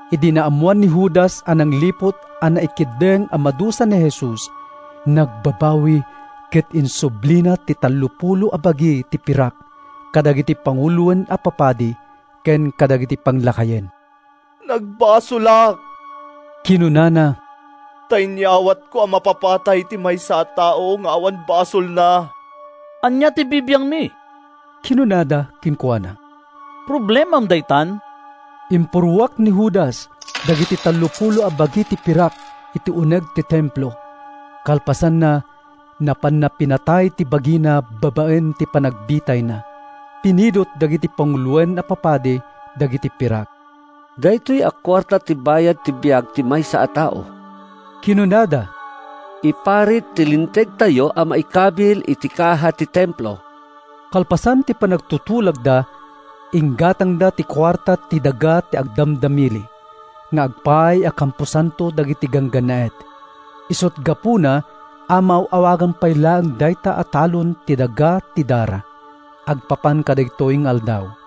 Idi naammoan ni Judas a nangliput a naikeddeng a madusa ni Jesus, nagbabawi ket insublina ti tallopulo a bagi ti pirak kadagiti panguloen a papadi ken kadagiti panglakayen. “Nagbasolak!” kinunana, “ta inyawatko a mapapatay ti maysa a tao nga awan basolna.” “Ania ti bibiangmi?” kinunada kenkuana. “Problemam daytan.” Impurruak ni Judas dagiti tallopulo a bagi ti pirak iti uneg ti Templo. Kalpasanna, napanna pinatay ti bagina babaen iti panagbitayna. Pinidut dagiti panguloen a papadi dagiti pirak. “Daytoy a kuarta ti bayad ti biag ti maysa a tao,” kinunada. “Iparit ti Lintegtayo a maikabil iti kaha ti Templo.” Kalpasan ti panagtutulagda, inggatangda ti kuarta iti “Daga ti Agdamdamili” nga agpaay a kamposanto dagiti ganggannaet. Isut’ gapuna a maaw-awagan pay laeng dayta a talon iti “Daga ti Dara” agpapan kadagitoy nga aldaw.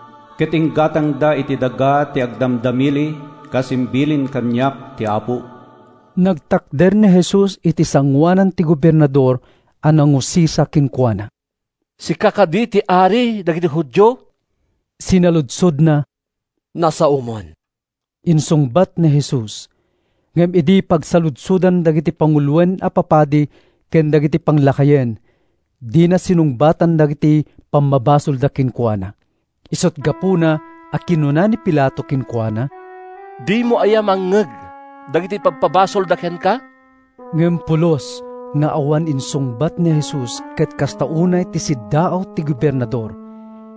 ket inggatangda iti daga ti agdamdamili, kas imbilin kaniak ti Apo.” Nagtakder ni Jesus iti sangoanan ti gobernador a nangusisa kenkuana. “Sika kadi ti Ari dagiti Judio?” sinaludsodna. “Nasaomon,” insungbat ni Jesus. Ngem idi pagsaludsodan dagiti panguloen a papadi ken dagiti panglakayen, dina sinungbatan dagiti pammabasolda kenkuana. Isut’ gapuna a kinuna ni Pilato kenkuana, “Dimo aya mangngeg dagiti ipabpabasolda kenka?” Ngem pulos nga awan insungbat ni Jesus ket kasta unay ti siddaaw ti gobernador.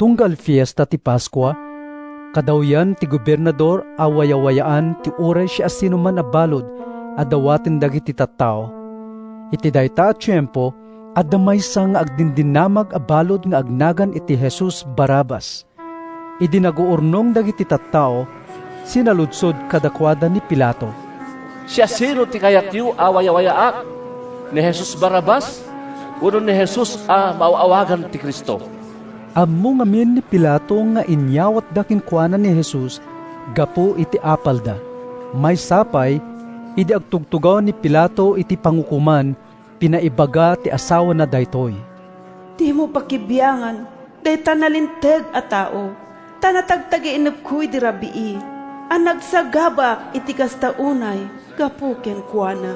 Tunggal Fiesta ti Paskua, kadawyan ti gobernador a wayawayaan ti uray siasinoman a balud a dawaten dagiti tattao. Iti dayta a tiempo, adda maysa nga agdindinamag a balud nga agnagan iti Jesus Barrabas. Idi naguurnong dagiti tattao, sinaludsod kadakuada ni Pilato: “Siasino ti kayatyo a wayawayaak? Ni Jesus Barrabas wenno ni Jesus a maaw-awagan iti Cristo?” Ammo ngamin ni Pilato nga inyawatda kenkuana ni Jesus gapu iti apalda. Maysa pay, idi agtugtugaw ni Pilato iti pangukoman, pinaibaga ti asawana daytoy: “Dimo pakibiangan dayta nalinteg a tao, ta natagtagainepko idi rabii a nagsagabaak iti kasta unay gapu kenkuana.”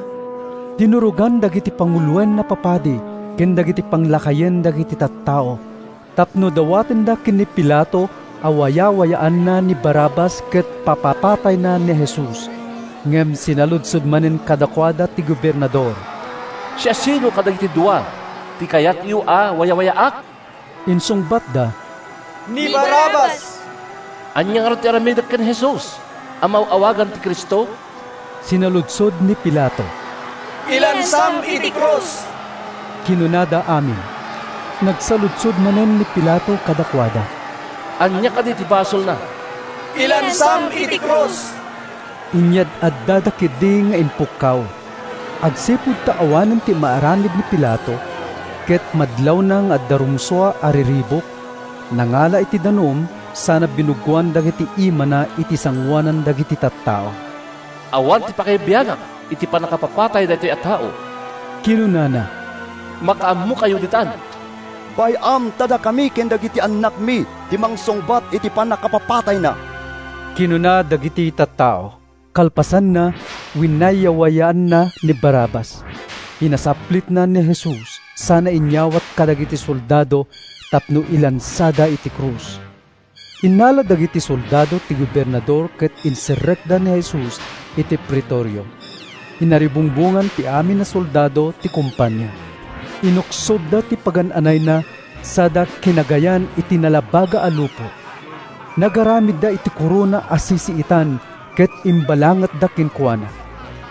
Dinurogan dagiti panguloen a papadi ken dagiti panglakayen dagiti tattao tapno dawatenda ken ni Pilato a wayawayaanna ni Barrabas ket papapatayna ni Jesus. Ngem sinaludsod manen kadakuada ti gobernador: “Siasino kadagiti dua ti kayatyo a wayawayaak?” “Ni Barrabas!” insungbatda. “Ania ngarud ti aramidek ken ni Jesus a maaw-awagan iti Cristo?” sinaludsod ni Pilato. “Ilansam iti krus,” kinunada amin. Nagsaludsod manen ni Pilato kadakuada: “Ania kadi ti basolna?” “Ilansam iti krus,” inyad-addada ketdi nga impukkaw. Agsipud ta awanen ti maaramid ni Pilato, ket madlawna nga adda rumsua a riribuk, nangala iti danum sana binuggoan dagiti imana iti sangoanan dagiti tattao. “Awan ti pakaibiangak iti pannakapapatay daytoy a tao,” kinunana. “Makaammokayo ditan.” “Bay-am ta dakami ken dagiti annakmi ti mangsungbat iti pannakapapatayna,” kinuna dagiti tattao. Kalpasanna, winayawayaanna ni Barrabas. Pinasaplitna ni Jesus sana inyawat kadagiti soldado tapno ilansada iti krus. Innala dagiti soldado ti gobernador ket inserrekda ni Jesus iti Pretorio. Inaribungbongan ti amin a soldado ti kompania. Inuksobda ti pagan-anayna sada kinagayan iti nalabaga a lupot. Nagaramidda iti korona a sisiitan ket imbalangatda kenkuana.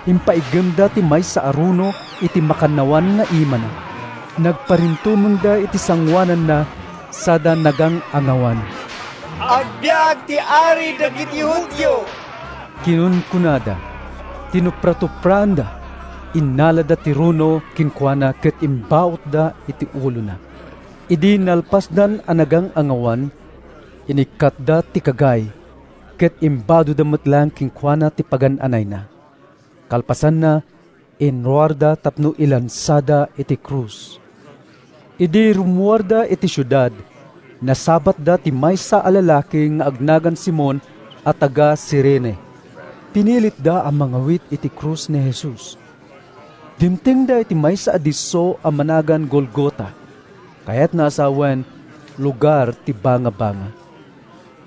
Impaiggemda ti maysa a runo iti makannawan nga imana. Nagparintumengda iti sangoananna sada nagang-angawan. “Agbiag ti Ari dagiti Judio!” kinunkunada. Tinupratupraanda. Innalada ti runo kenkuana ket imbautda iti ulona. Idi nalpasdan a nagangangawan, inikkatda ti kagay, ket imbadoda met laeng kenkuana ti pagan-anayna. Kalpasanna, inruarda tapno ilansada iti krus. Idi rummuarda iti siudad, nasabatda ti maysa a lalaki nga agnagan Simon a taga-Cirene. Pinilitda a mangawit iti krus ni Jesus. Dimtengda iti maysa a disso a managan Golgota, kayatna a sawen “Lugar ti Bangabanga.”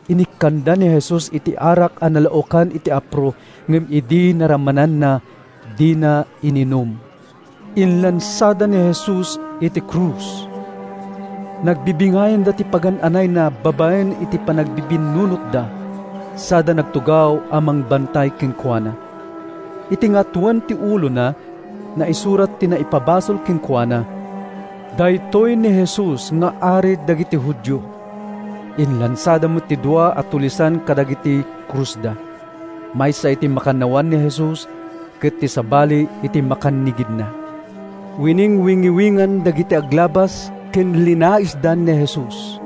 Inikkanda ni Jesus iti arak a nalaokan iti apro, ngem idi naramananna, dina ininum. Inlansada ni Jesus iti krus. Nagbibingayanda ti pagan-anayna babaen iti panagbibinnunotda sada nagtugaw a mangbantay kenkuana. Iti ngatoen ti ulona, naisurat ti naipabasol kenkuana: “Daytoy ni Jesus nga Ari dagiti Judio.” Inlansada met ti dua a tulisan kadagiti krusda: maysa iti makannawan ni Jesus ket ti sabali iti makannigidna. Winingwingiwingan dagiti aglabas ken linalaisda ni Jesus: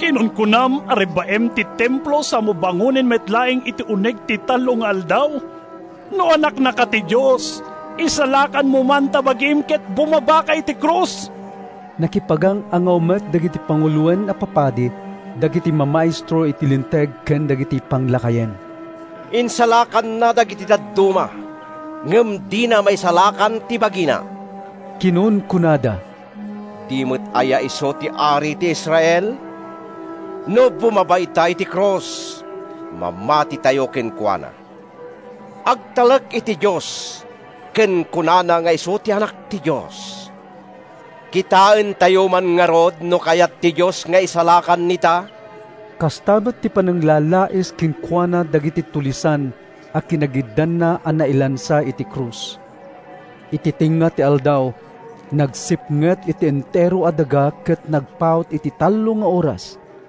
“Kinunkunam a rebbaem ti Templo samo bangonen met laeng iti uneg ti tallo nga aldaw. No Anaknaka ti Dios, isalakanmo man ta bagim ket bumabaka iti krus!” Nakipagang-angaw met dagiti panguloen a papadi, dagiti mamaestro iti Linteg ken dagiti panglakayen. “Insalakanna dagiti dadduma ngem dina maisalakan ti bagina!” kinunkunada. “Di met aya isu ti Ari ti Israel? No bumaba ita iti krus, mamatitayo kenkuana. Agtalek iti Dios ken kunana nga isu Anak ti Dios. Kitaentayo man ngarud no kayat ti Dios nga isalakan ita!” Kasta met ti pananglalais kenkuana dagiti tulisan a kinagiddanna a nailansa iti krus. Iti tengnga ti aldaw, nagsipnget iti entero a daga ket nagpaut iti tallo nga oras.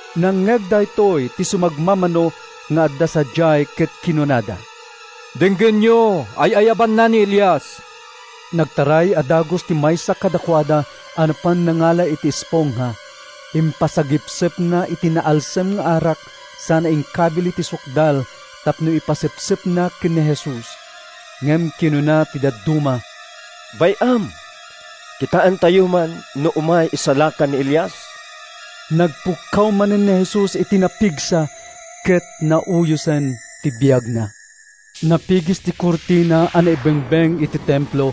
Nangngeg daytoy ti sumagmamano nga adda sadiay ket kinunada: “Denggenyo, ay-ayabanna ni Elias!” Nagtaray a dagus ti maysa kadakuada a napan nangala iti espongha. Impasagepsepna iti naalsem nga arak sana inkabil iti sukdal tapno ipasepsepna ken ni Jesus. Ngem kinuna ti dadduma: “Bay-am, kitaentayo man no umay isalakan ni Elias.” Nagpukkaw manen ni Jesus iti napigsa ket nauyosen ti biagna. Napigis ti kurtina a naibengbeng iti Templo: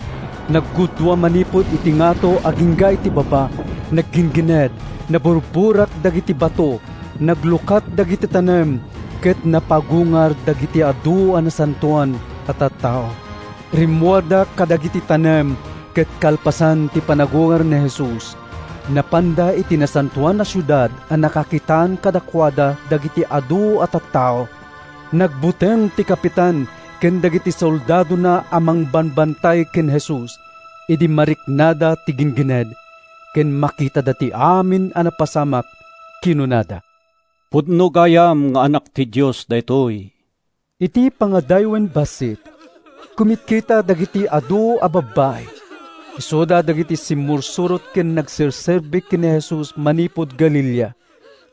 naggudua manipud iti ngato agingga iti baba. Nagginggined, naburburak dagiti bato, naglukat dagiti tanem, ket napagungar dagiti adu a nasantoan a tattao. Rimmuarda kadagiti tanem ket kalpasan ti panagungar ni Jesus, napanda iti Nasantoan a Siudad a nakakitaan kadakuada dagiti adu a tattao. Nagbuteng ti kapitan ken dagiti soldadona a mangbambantay ken ni Jesus idi mariknada ti ginggined ken makitada ti amin a napasamak. Kinunada, “Pudno gayam nga Anak ti Dios daytoy!” Iti pangadaywen bassit, kumitkita dagiti adu a babbai. Isuda dagiti simmursurot ken nagserserbi ken ni Jesus manipud Galilea.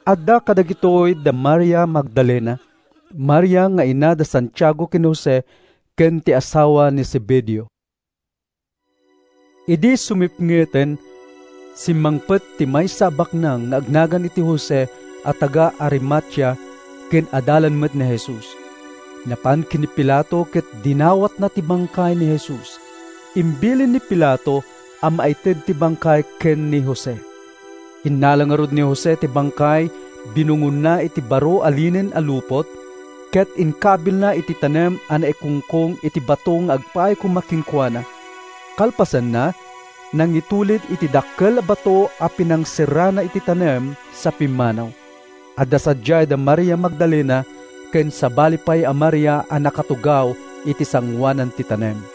Adda kadagitoy da Maria Magdalena, Maria nga ina da Santiago ken Jose ken ti asawa ni Zebedeo. Idi sumipngeten, simmangpet ti maysa a baknang nga agnagan iti Jose a taga-Arimatea ken adalan met ni Jesus. Napan ken ni Pilato ket dinawatna ti bangkay ni Jesus. Imbilin ni Pilato a maited ti bangkay ken ni Jose. Innala ngarud ni Jose ti bangkay, binungonna iti baro a linen a lupot, ket inkabilna iti tanem a naikungkong iti bato nga agpaay koma kenkuana. Kalpasanna, nangitulid iti dakkel a bato a pinangserrana iti tanem sa pimmanaw. Adda sadiay da Maria Magdalena ken sabali pay a Maria a nakatugaw iti sangoanan ti tanem.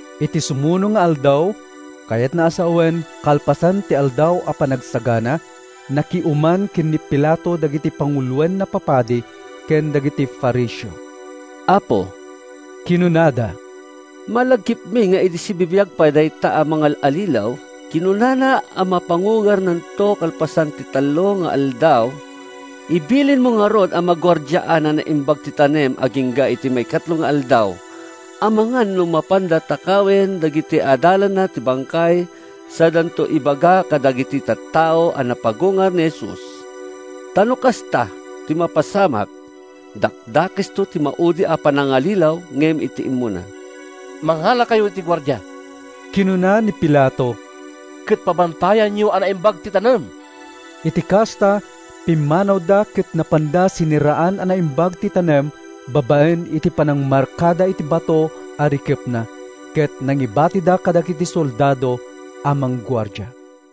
Iti sumuno nga aldaw, kayatna a sawen, kalpasan ti Aldaw a Panagsagana, nakiuman ken ni Pilato dagiti panguloen a papadi ken dagiti Fariseo. “Apo,” kinunada, “malagipmi nga idi sibibiag pay dayta a mangal-allilaw, kinunana a mapagungarto kalpasan ti tallo nga aldaw. Ibilinmo ngarud a maguardiaan a naimbag ti tanem agingga iti maikatlo nga aldaw amangan no mapan takawen dagiti adalanna ti bangkay sadanto ibaga kadagiti tattao a napagungar ni Jesus. Ta no kasta ti mapasamak, dakdakesto ti maudi a panangallilaw ngem ti immuna.” “Mangalakayo iti guardia,” kinuna ni Pilato, “ket pabantayanyo a naimbag ti tanem.” Iti kasta, pimmanawda ket napanda sinerraan a naimbag ti tanem babaen iti panangmarkada iti bato a rikepna, ket nangibatida kadagiti soldado a mangguardia.